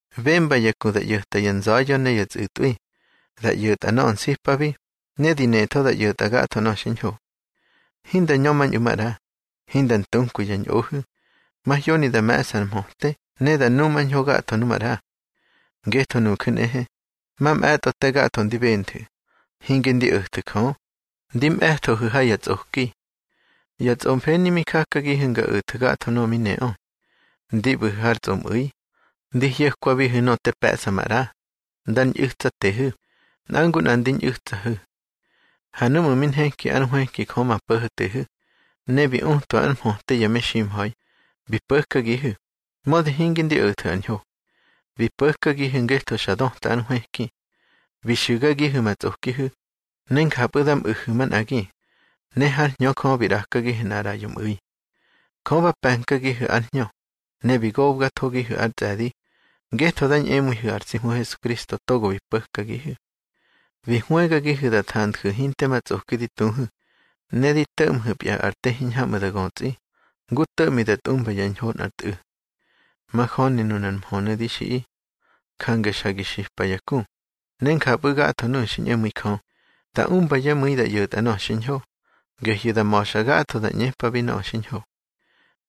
Bemba ya ku da ꞌyo̱ta ya nza̱ya̱ ne ya tsꞌu̱tꞌwi, da ꞌyo̱ta nöꞌö nsipabi, ne di netho da ꞌyo̱tꞌa gatho nöꞌö xiñho. Hinda ñömañꞌu̱ maꞌra, hinda ntunkwi yá ñꞌohu̱, mahyoni da me̱ꞌsa ar mhöte ne da numañho gatho nu maꞌra. Ngetho nuju̱ nꞌehe, mamꞌe̱tꞌo te gatho ndi benthu̱, hinge ndi o̱thu̱ Jö, ndi mꞌe̱thohu̱ ha ya tsꞌoki. Ya tsꞌomfeni mi jakagihu̱ nga o̱thu̱ gatho nöꞌö mi neꞌö. Ndi ꞌbu̱hu̱ har tsꞌomꞌu̱i, ndi hyo̱kwabihu̱ nöꞌö te pe̱ꞌsa maꞌra, ndar ñꞌu̱tsatehu̱, nꞌa ngu nꞌa ndi ñꞌu̱tsahu̱. Ha núꞌmu̱ mi nheki ár nhwëki Jö ma Po̱ho̱tehu̱, ne bi utwa ár mhöte ya meximha̱i, bi po̱kagihu̱, mödi hinge ndi o̱thu̱ ar ñho. Bi po̱kagihu̱ ngetho xa döta ár nhwëki. Bi xu̱gagihu̱ ma tsꞌokihu̱ ne njapꞌu̱ da mꞌu̱hu̱ manꞌagi, ne hár Hñö Jö bi ꞌrakagihu̱ nꞌar ꞌraꞌyo mꞌu̱i. Jö ba pe̱nkagihu̱ ár Hñö, ne bi gobgathogihu̱ ár tsꞌe̱di, ngetho da ñꞌemu̱ihu̱ ar tsi Hmu Hesukristo togo bi po̱kagihu̱. Bi hwëgagihu̱ da thanju̱ hinte ma tsꞌoki di tuhu̱, ne di to̱ꞌmhu̱pya ar te hiñhamꞌu̱ da götsꞌi, ngu to̱ꞌmi da tꞌumba yá ñho nꞌar tꞌu̱. Majöni nunar mhönu̱ di xiꞌi. Jange xa gi xipa ya ku, ne njapꞌu̱ gatho nuꞌu̱ xi ñꞌemu̱i Jö, da umba yá mu̱i da ꞌyo̱tꞌa nöꞌö xiñho, gehyu̱ da ma̱xa gatho da ꞌñepabi nöꞌö xiñho.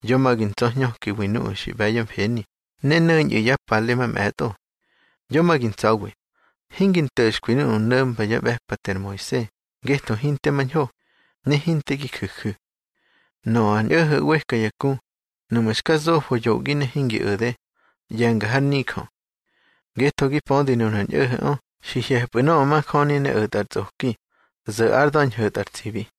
Yo ma gi ntsa̱hñökiwi nuꞌu̱ xi ꞌbe̱ yá mfeni ne no̱ñꞌu̱ yá pale mamꞌe̱tꞌo. Yo ma gi ntsa̱wi, hingi nto̱xkwi nuꞌu̱ no̱mba yá ꞌbe̱pate ar Moise, ngetho hinte mañho, ne hinte gi ju̱ju̱. Nöꞌö ar ñꞌo̱ho̱ ꞌweka ya ku, nuꞌmu̱ xka zofo yoꞌgi ne hingi o̱de, ꞌye̱nga har nijö. Ngetho gi pödi nunar ñꞌo̱ho̱ꞌö xi hye̱pꞌu̱ nöꞌö majöni ne o̱tꞌa ar tsꞌoki, zo̱ ár da̱ ñho̱tꞌa ar tsibi.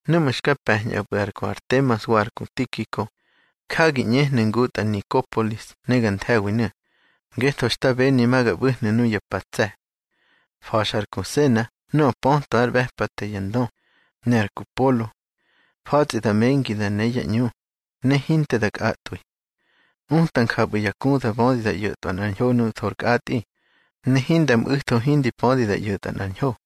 Núꞌmu̱ xka pe̱ñꞌapꞌu̱ ar ku Artemas wa ar ku Tikiko, já gi ꞌñehnu̱ ngutꞌa Nikopolis ne ga nthe̱winu̱, ngetho xta beni ma ga ꞌbu̱hnu̱ nuya pa ya tse̱. Fa̱xa ar ku Sena nöꞌö pötwa yá ꞌbe̱pate ya ndö, ne ar ku Polo. Fa̱tsꞌi da mengi da ne yá ꞌñu, ne hinte da kꞌatꞌwi. Uta njapꞌu̱ ya ku da bödi da ꞌyo̱tꞌwa nꞌar ñho nuꞌu̱ thor kꞌatꞌi, ne hinda mꞌu̱tho hindi pödi da ꞌyo̱tꞌa nꞌar ñho.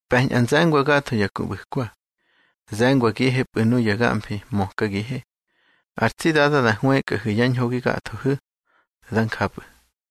Pe̱ñꞌa nze̱ngwa gatho ya ku ꞌbu̱kwa. Ze̱ngwagihepꞌu̱ nuya gamfi mökagihe. Ar tsi Dada da hwëkꞌahu̱ yá ñho gi gathohu̱. Dá njapꞌu̱.